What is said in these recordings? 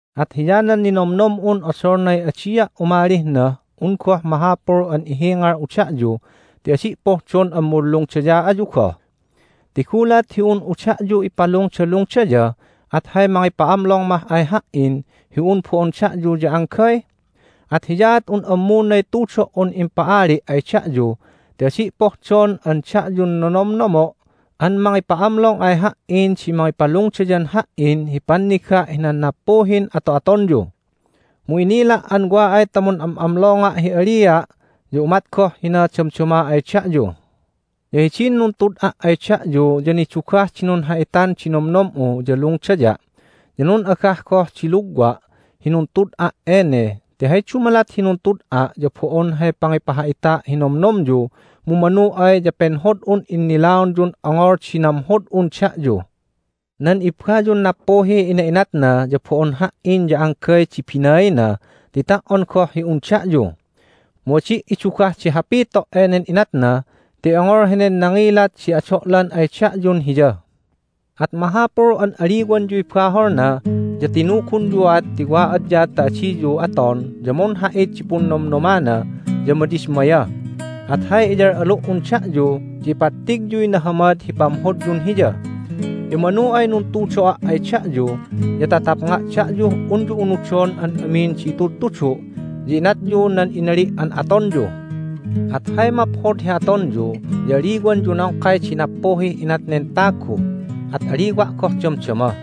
At hiyanan ninomnom'un odolnay adia' umalih nah un goh mahapul an ihingal'u da'yu ti adi' pohdon an munlungdaya ayu goh. Ti gulat hi un'u da'yu ipalungdalungdaya at hay mangipa'amlong mah ay ha"in hi un bo'on da'yu ya anggay? At hiyaat un ammunay tudo"un impa'ali' ay da'yu ti adi' pohdon an da'yun nonomnomo' an mangipa'amlong ay ha"in di mangipalungdayan ha"in hi panniga' hinan nappuhin ato'atonyu. Mu inila' an wa ay ta mun'am'amlonga' hi alia' ya umat goh hina damdama ay da'yu. Ya hidin nuntud'a' ay da'yu ya nidugah di nunha'itan di nomnom'u ya lungdaya', ya nun'agah goh di lugwa' hi nuntud'a' ene. Ti hay dumalat hi nuntud'a' ya bo'on hay pangipaha'ita' hi nomnomyu mu manu ay ya penhod'un innilaonyun ongol di namhod'un da'yu. Nan ibbayun nappuhiy ina'inatna ya bo'on ha"in ya anggay di binaina ti ta"on goh hi un da'yu. Mu adi' idugah di hapito' enen inatna ti ongol henen nangilat di ado'lan ay da'yun hiya. At mahapul an aliwanyuy baholna, ya tinugunyuat ti wa adya ta adiyu aton ya munha'it di punnomnomana ya madismaya. At hay iyal'alu"un da'yu ya ipattigyuy nahamad hi pamhodyun hiya! Ya manu ay nuntudo'a' ay da'yu ya ta tapnga' da'yuh unyu unudon an amin di itudtudu', ya inatyu nan inali' an atonyu. At hay maphod hi atonyu ya aliwanyu nongkay di nappuhih inat nen tagu. At aliwa' goh damdama.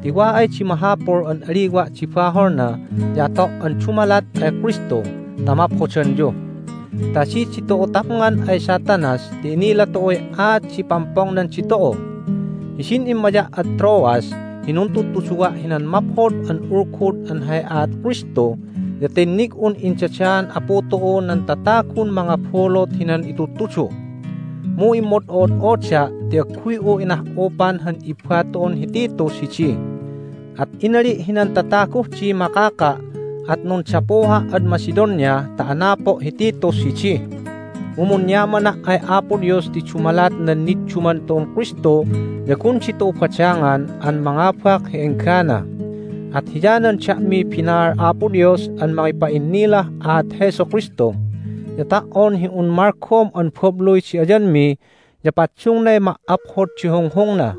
Ti wa ay di mahapul an aliwa' di baholna ya ato' an dumalat ay Kristu ta amaphodanyu. Ta adi ditu'u tapngan ay Satanas ti inila tu'uy aat di pampongnan ditu'u. Hidin immaya' ad Troas hi nuntudtuduwa' hinan Maphod an Ulgud an hay aat Kristu ya tinnig'un indadaan Apu tu'u nan tatagun mangabulut hinan itudtudu'. Mu immod'o'od'oda' ti agguy'u inah'upan han ibba tu'un hi Titus hidi. At inali' hinan tataguh dih makaka', at nundapuha' ad Macedonia ta anapo' hi Titus hidi. Mu munyamana' ay Apo Dios ti dumalat nan nidduman tu'un Kristu ya gun ditu'u badangan an mangabak hi enggana! At hiyanan da'miy binaal Apo Dios an mangipa'innilah aat Jesu Kristu, ya ta"on hi un malgom an babluy di ayanmi ya paddungnay ma"aphod di hunghungna.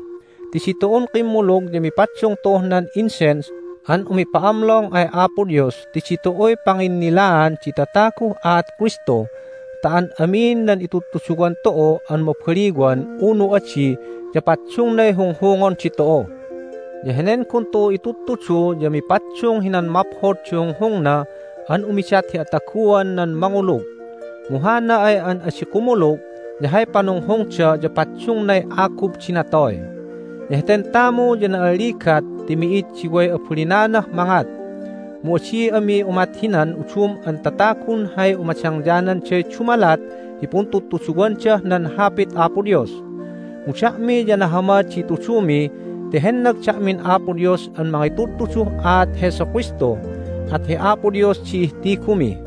Ti ditu'un kimmulug ya mipaddung tu'uh nan incense an umipa'amlong ay Apo Dios ti ditu'uy panginnilaan di tataguh aat Kristu ta an amin nan itudtuduwan tu'u an mabaliwan unu adi ya paddungnay hunghungon ditu'u. Ya henen gun tu'u intudtudu ya mipaddung hinan maphod di hunghungna an umidat hi ataguan nan mangulug, mu hana ay an adi kumulug ya hay panunghungda ya paddungnay agub di natoy. Ya heten tamu ya na'alligat ti mi'id di way abalinanah mangat, mu adi ami umat hinan udum an tatagun hay umadangyananday dumalat hi puntudtuduwandah nan Hapit Apo Dios. Mu da'mi ya nahamad di itudumi ti hennag da'min Apo Dios an mangitudtuduh aat Jesu Kristu, at hi Apo Dios di ihtigumi.